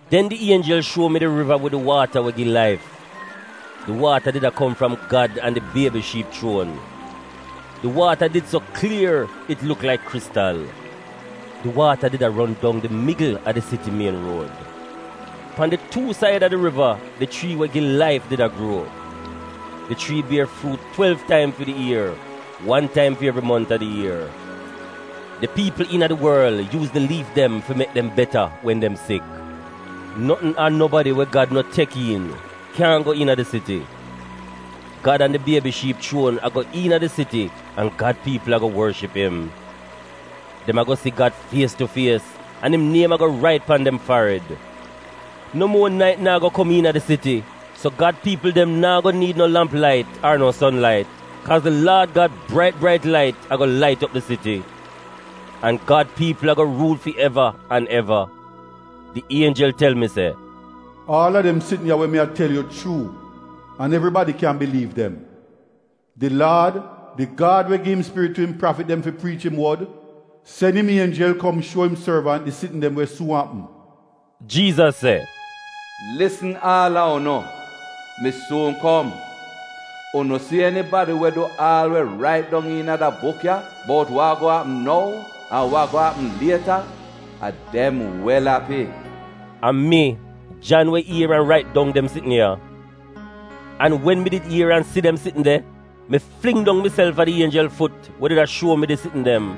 Den di ienjel shuo mi di riva wid di waata we gi laif. Di waata did a kom fram Gad an di Biebi Shiip chuon. Di waata did so klier it luk laik kristal. Di waata did a ron dong di migl a di siti mien ruod. Pan di tuu saida di riva, di chrii we gi laif did a gruo. Di chrii bier fruut twelv taim fi di ier — wan taim fi evri mont a di ier. Di piipl iina di worl yuuz di liif dem fi mek dem beta wen dem sik. Notn ar nobadi we Gad no aksep kyaahn go iina di siti. Gad an di Biebi Shiip chuon a go iina di siti an Gad piipl ago worship im. Dem ago si Gad fies tu fies, an im niem ago rait pan dem farid. No muo nait naa go kom iina di siti, so Gad piipl dem naa go niid no lamp lait nar no son lait, kaaz di Laad Gad brait brait lait ago lait op di siti. An Gad piipl ago ruul fi eva an eva. Di ienjel tel mi se, “Aal a dem sitn ya we mi a tel yu chuu an evribadi kyan biliiv dem. Di Laad, di Gad we gi'im Spirit tu im prafit dem fi priich im wod, sen im ienjel kom shuo im sorvant di sitn dem we suun apm.” Jiizas se, “Lisn, aal a unu, mi suun kom! Unu si enibadi we du aal we rait dong iina da buk ya bout wa ago apm nou an wa ago apm lieta, a dem wel api.” A mi, Jan, we ier an rait dong dem sitn ya. An wen mi did ier an si dem sitn de, mi fling dong miself a di ienjel fut we did a shuo mi di sitn dem.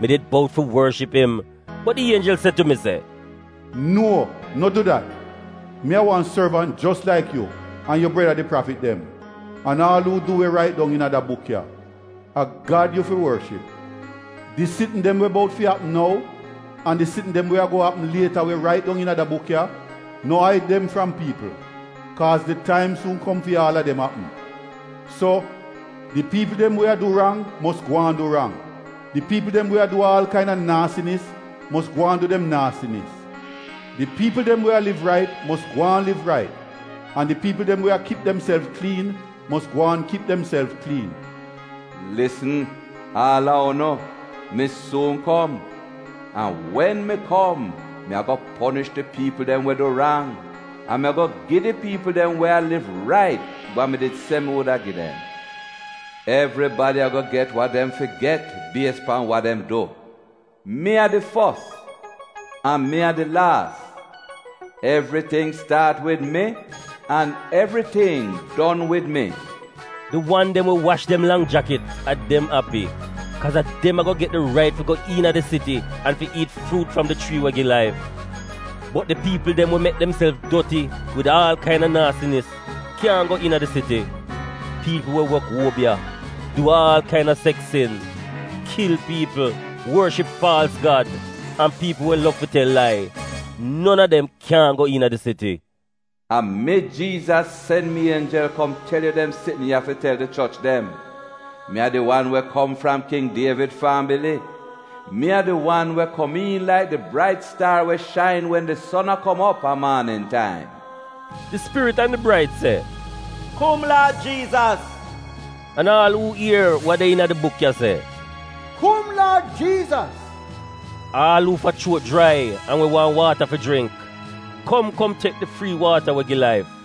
Mi did bout fi worship im, bot di ienjel se tu mi, “No, no du dat! Mi a wan sorvant jos laik yu an yu breda — di prafit dem, an aal uu du we rait dong iina da buk ya. A Gad yu fi worship!” “Di sitn dem we bout fi apm nou, an di sitn dem we ago apm lieta we rait dong iina da buk ya, no aid dem fram piipl, kaaz di taim suun kom fi aal a dem apm. So, di piipl dem we a du rang mos gwaan du rang. Di piipl dem we a du aal kaina naasinis mos gwaan du dem naasinis. Di piipl dem we a liv rait mos gwaan liv rait, an di piipl dem we a kip demself kliin mos gwaan kip demself kliin.” “Lisn, aal a unu, mi suun kom! An wen mi kom mi ago ponish di piipl dem we du rang, an mi ago gi di piipl dem we a liv rait wa mi did se mi wuda gi dem. Evribadi ago get wa dem fi get bies pan wa dem du. Mi a di leta Ie an mi a di leta Zed. Evriting staat wid mi, an evriting en wid mi.. “Di wan dem we wash dem lang jakit a dem api, kaaz a dem ago get di rait fi go iina di siti an fi iit fruut fram di chrii we gi laif. Bot di piipl dem we mek demself doti wid aal kaina naasinis kyaahn go iina di siti: piipl we wok obiya, du aal kaina seks sin, kil piipl, worship faalz gad, an piipl we lov fi tel lai, non a dem kyaahn go iina di siti. “A mi, Jiizas, sen mi ienjel kom tel yu dem sitn ya fi tel di choch dem. Mi a di wan we kom fram King Dievid fambili — Mi a di wan we komiin laik di brait staar we shain wen di son a kom op a maanin taim.” Di Spirit an di braid se, “Kum Laad Jiizas!” An aal uu ier wa de iina da buk ya, se, “Kum Laad Jiizas!” Aal uu fa chuot jrai an we waahn waata fi jringk, kom kom tek di frii waata we gi laif.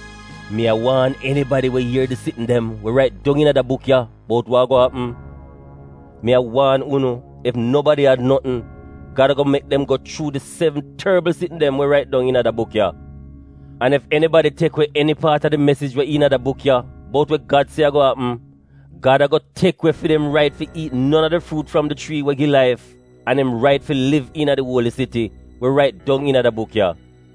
Mi a waan enibadi we ier di sitn dem we rait dong iina da buk ya bout wa ago apm. Mi a waan unu, ef nobadi ad notn, Gad ago mek dem go chuu di sevn torbl sitn dem we rait dong iina da buk ya. An ef enibadi tek we eni paat a di mesij we iina da buk ya bout we Gad se ago apm, Gad ago tek we fi dem rait fi iit non a di fruut fram di chrii we gi laif an im rait fi liv iina di uoli siti, we rait dong iina da buk ya.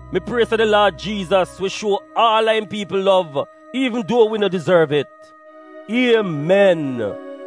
Mi prie se di Laad Jiizas wi shuo aal a im piipl lov iivn duo wi no dizorv. Iemen!